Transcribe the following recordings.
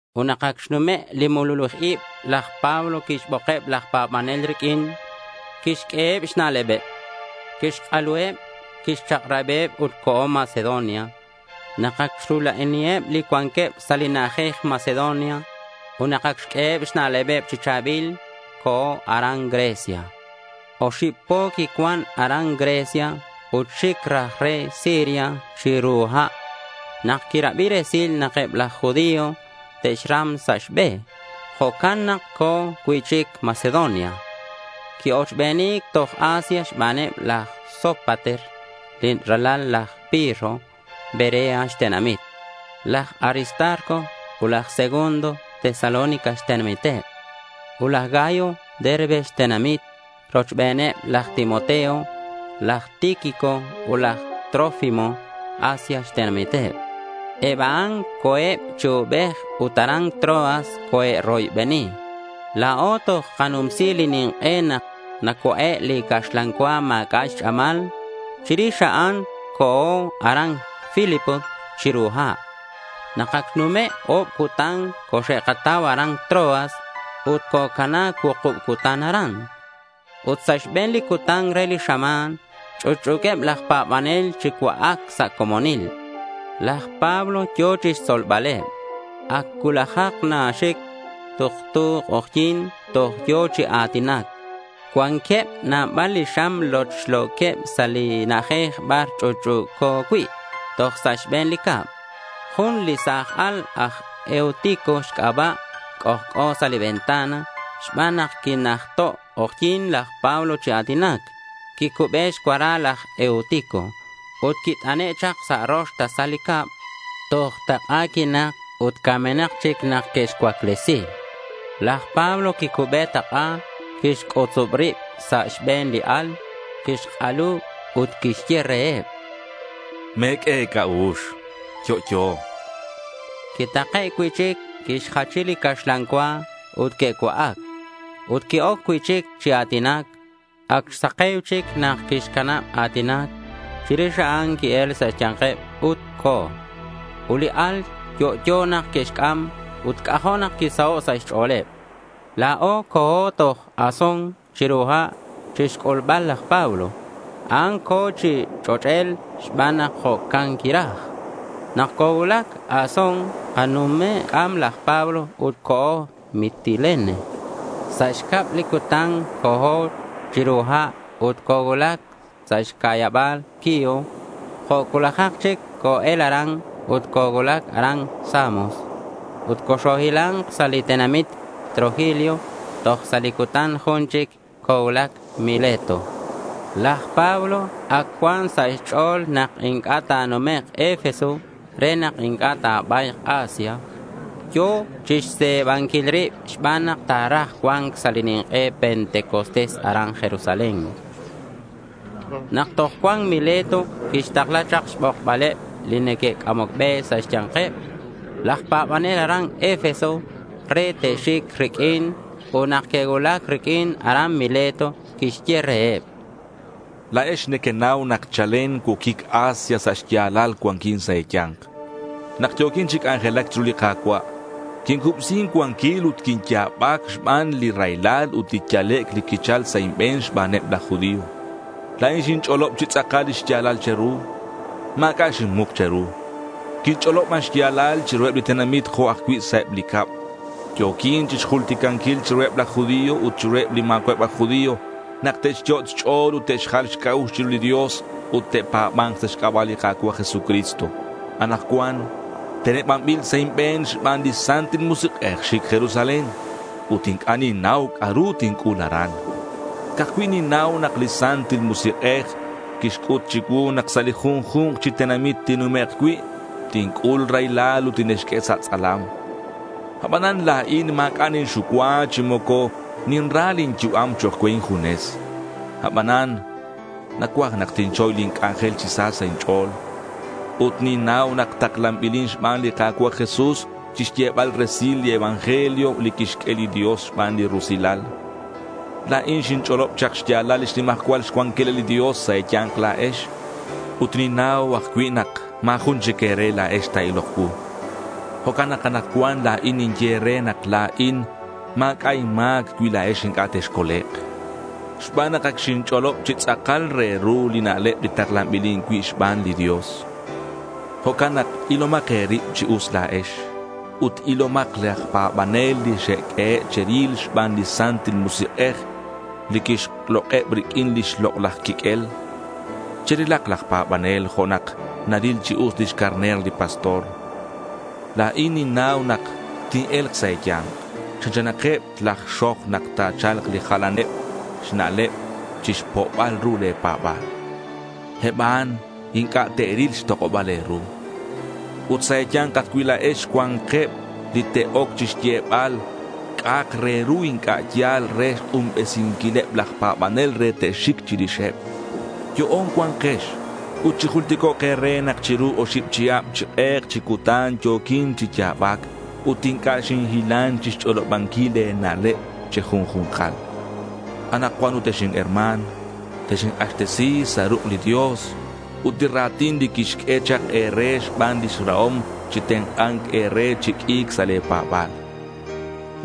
Ut nak ac xnume' li mululij ib, laj Pablo quixbokeb laj pa̱banel riq'uin. Quixq'ueheb xna'leb, quixk'aluheb, quixchak'rabiheb ut co̱ Macedonia. Nak ac xrula'aniheb li cuanqueb sa' li na'ajej Macedonia, ut nak ac xq'ueheb xna'leb chi cha̱bil, co̱ aran Grecia. Oxib po quicuan aran Grecia ut xic raj re Siria chiru ha' nak quirabi resil nak eb laj judío te'xram sa' xbe. Jo'can nak co̱ cui'chic Macedonia. Qui-ochbeni̱c toj Asia xbaneb laj Sópater li ralal laj Pirro, Berea xtenamit; laj Aristarco ut laj Segundo, Tesalónica xtenamiteb; ut laj Gayo, Derbe xtenamit; rochbeneb laj Timoteo, laj Tíquico ut laj Trófimo, Asia xtenamiteb. Eb a'an co̱eb chi ubej ut aran Troas coe'roybeni. La̱o toj kanumsi li nink'e nak nacua'e' li caxlan cua ma̱c'a' xch'amal. Chirix a'an co̱o aran Filipos chiru ha'. Nak ac xnume' o̱b cutan coxe'katau aran Troas, ut cocana cuukub cutan aran. Ut sa' xbe̱n li cutan re li xama̱n, ch'utch'u̱queb laj pa̱banel chi cua'ac sa' comonil. Laj Pablo yo̱ chixtzolbaleb. Ac cuulajak naxic. Tuktu k'ojyi̱n toj yo̱ chi a̱tinac. Cuanqueb nabal li xam lochlo̱queb sa' li na'ajej bar ch'utch'u̱co cui' toj sa' xbe̱n li cab. Jun li sa̱j al, aj Eutico xc'aba', c'ojc'o sa' li ventana. Xban nak quinajto' k'ojyi̱n laj Pablo chi a̱tinac, quicube xcuara laj Eutico, ut quit'ane' chak sa' rox tasal li cab. Toj tak'a quinak. Ut camenak chic nak que'xcuaclesi. Laj Pablo quicube tak'a, quixc'utzub rib sa' xbe̱n li al, quixk'alu ut quixye reheb: —Me̱q'ue e̱c'a'ux. Yo'yo, chan. Quitake' cui'chic, quixjachi li caxlan cua, ut que'cua'ac. Ut qui-oc cui'chic chi a̱tinac. Ac xsake̱u chic nak quixcanab a̱tinac. Chirix a'an qui-el sa' xya̱nkeb ut co̱. Ut li al yo'yo nak que'xc'am. Ut c'ajo' nak quisaho' sa' xch'o̱leb. La̱o co̱o toj Asón chiru ha' chixc'ulbal laj Pablo. A'an co̱ chi ch'och'el xban nak jo'can quiraj. Nak cocuulac Asón kanume'c'am laj Pablo ut co̱o Mitilene. Sa' xcab li cutan co̱o chiru ha' ut cocuulac sa' xca'yaba̱l Quío. Jo' cuulajak chic co-el aran ut cocuulac aran Samos. Ut coxohila̱nk sa' li tenamit Trogilio. Toj sa' li cutan jun chic cocuulac Mileto. Laj Pablo ac cuan sa' xch'o̱l nak inc'a' ta̱numek' Efeso re nak inc'a' ta̱ba̱yk Asia. Yo̱ chixse̱banquil rib xban nak ta̱raj cua̱nc sa' li nink'e Pentecostés aran Jerusalén. Nak toj cuan Mileto quixtakla chak xbokbaleb li neque'c'amoc be sa' xya̱nkeb laj pa̱banel aran Efeso re te'xic riq'uin. Ut nak que'cuulac riq'uin aran Mileto, quixye reheb: —La̱ex nequenau nak chalen cuoquic Asia sa' xya̱lal cuanquin sa' e̱ya̱nk. Nak yo̱quin chi c'anjelac chiru li Ka̱cua' quincubsi incuanquil ut quinya̱bac xban li raylal ut li yalec' li quichal sa' inbe̱n xbaneb laj judío. La̱in xinch'olob chi tz'akal li xya̱lal che̱ru. Ma̱c'a' xinmuk che̱ru. Quinch'olob ban xya̱lal chiruheb li tenamit jo' ajcui' sa' eb li cab. Yo̱quin chixjulticanquil chiruheb laj judío ut chiruheb li ma̱cua'eb aj judío, nak te'xyot' xch'o̱l ut te'xjal xc'a'ux chiru li Dios ut te'pa̱ba̱nk sa' xc'aba' li Ka̱cua' Jesucristo. Anakcuan tenebanbil sa' inbe̱n xban li Santil Musik'ej xic Jerusalén. Ut inc'a' ninnau c'a'ru tinc'ul aran. Ca'aj cui' ninnau nak li Santil Musik'ej quixc'ut chicuu nak sa' li junju̱nk chi tenamit tinnumek' cui', tinc'ul raylal ut tine'xq'ue sa' tz'alam. Abanan la̱in ma̱c'a' ninxucua, chi moco ninra lin yu'am chok' cue injunes. Abanan nacuaj nak tinchoy lin c'anjel chi sa sa' inch'o̱l. Ut ninnau nak taklanbilin xban li Ka̱cua' Jesús chixyebal resil li evangelio li quixq'ue li Dios xban li rusilal. La̱in xinch'olob chak xya̱lal lix nimajcual cuanquilal li Dios sa' e̱ya̱nk la̱ex. Ut ninnau ajcui' nak ma̱ jun chic e̱re la̱ex ta̱ilok cuu. Jo'can nak anakcuan la̱in ninye e̱re nak la̱in ma̱c'a' inma̱c cui la̱ex inc'a' texcolek', xban nak ac xinch'olob chi tz'akal re ru li na'leb li taklanbilin cui' xban li Dios. Jo'can nak ilomak e̱rib chi us la̱ex ut ilomakeb laj pa̱banel li xe'q'uehe' cheril xban li Santil Musik'ej, li quixlok'eb riq'uin lix lok'laj quiq'uel. Cherilak laj pa̱banel jo' nak naril chi us lix carner li pastor. La̱in ninnau nak tine̱lk sa' e̱ya̱nk, chanchanakeb laj xoj nak te'cha̱lk li jalaneb xna'leb chixpo'bal ru le̱ pa̱ba̱l. Eb a'an inc'a' te'ril xtok'oba̱l e̱ru. Ut sa' e̱ya̱nk ajcui' la̱ex cua̱nkeb li te'oc chixyebal c'a'ak re ru inc'a' ya̱l re xk'unbesinquileb laj pa̱banel re te'xic chirixeb. Yo'on cua̱nkex ut chijulticok' e̱re nak chiru oxib chihab, chi k'ek chi cutan yo̱quin chi ya̱bac ut inc'a' xinhilan chixch'olobanquil e̱na'leb che̱junju̱nkal. Anakcuan ut ex herma̱n, texink'axtesi sa' ruk' li Dios ut li ra̱tin li quixq'ue chak e̱re xban lix rahom chitenk'a̱nk e̱re chi q'ui̱c sa' le̱ pa̱ba̱l.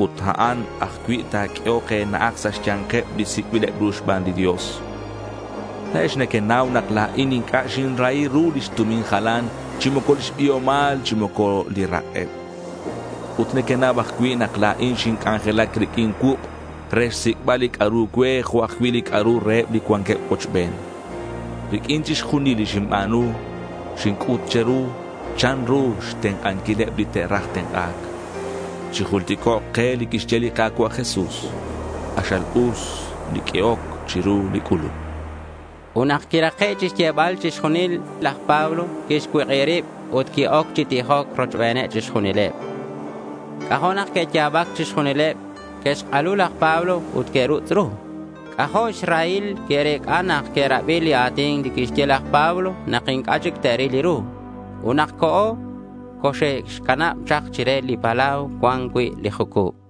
Ut a'an ajcui' ta̱q'uehok e̱na'aj sa' xya̱nkeb li sic'bileb ru xban li Dios. La̱ex nequenau nak la̱in inc'a' xinrahi ru lix tumin jalan, chi moco lix biomal, chi moco li rak'eb. Ut nequenau ajcui' nak la̱in xinc'anjelac riq'uin cuuk' re xsic'bal li c'a'ru cue jo' ajcui' li c'a'ru reheb li cuanqueb cuochben. Riq'uin chixjunil li xinba̱nu, xinc'ut che̱ru chanru xtenk'anquileb li te'raj tenk'a̱c. Chijulticok' ke li quixye li Ka̱cua' Jesús: K'axal us li q'uehoc chiru li c'uluc, chan. Ut nak quirake' chixyebal chixjunil a'in, laj Pablo quixcuik'ib rib ut qui-oc chi tijoc rochbeneb chixjunileb. C'ajo' nak que'ya̱bac chixjunileb. Que'xk'alu laj Pablo ut que'rutz' ru. C'ajo' xrahil que'rec'a nak que'rabi li a̱tin li quixye laj Pablo nak inc'a' chic te'ril ru. Ut nak co̱, coxe'xcanab chak chire li palau cuan cui' li jucub.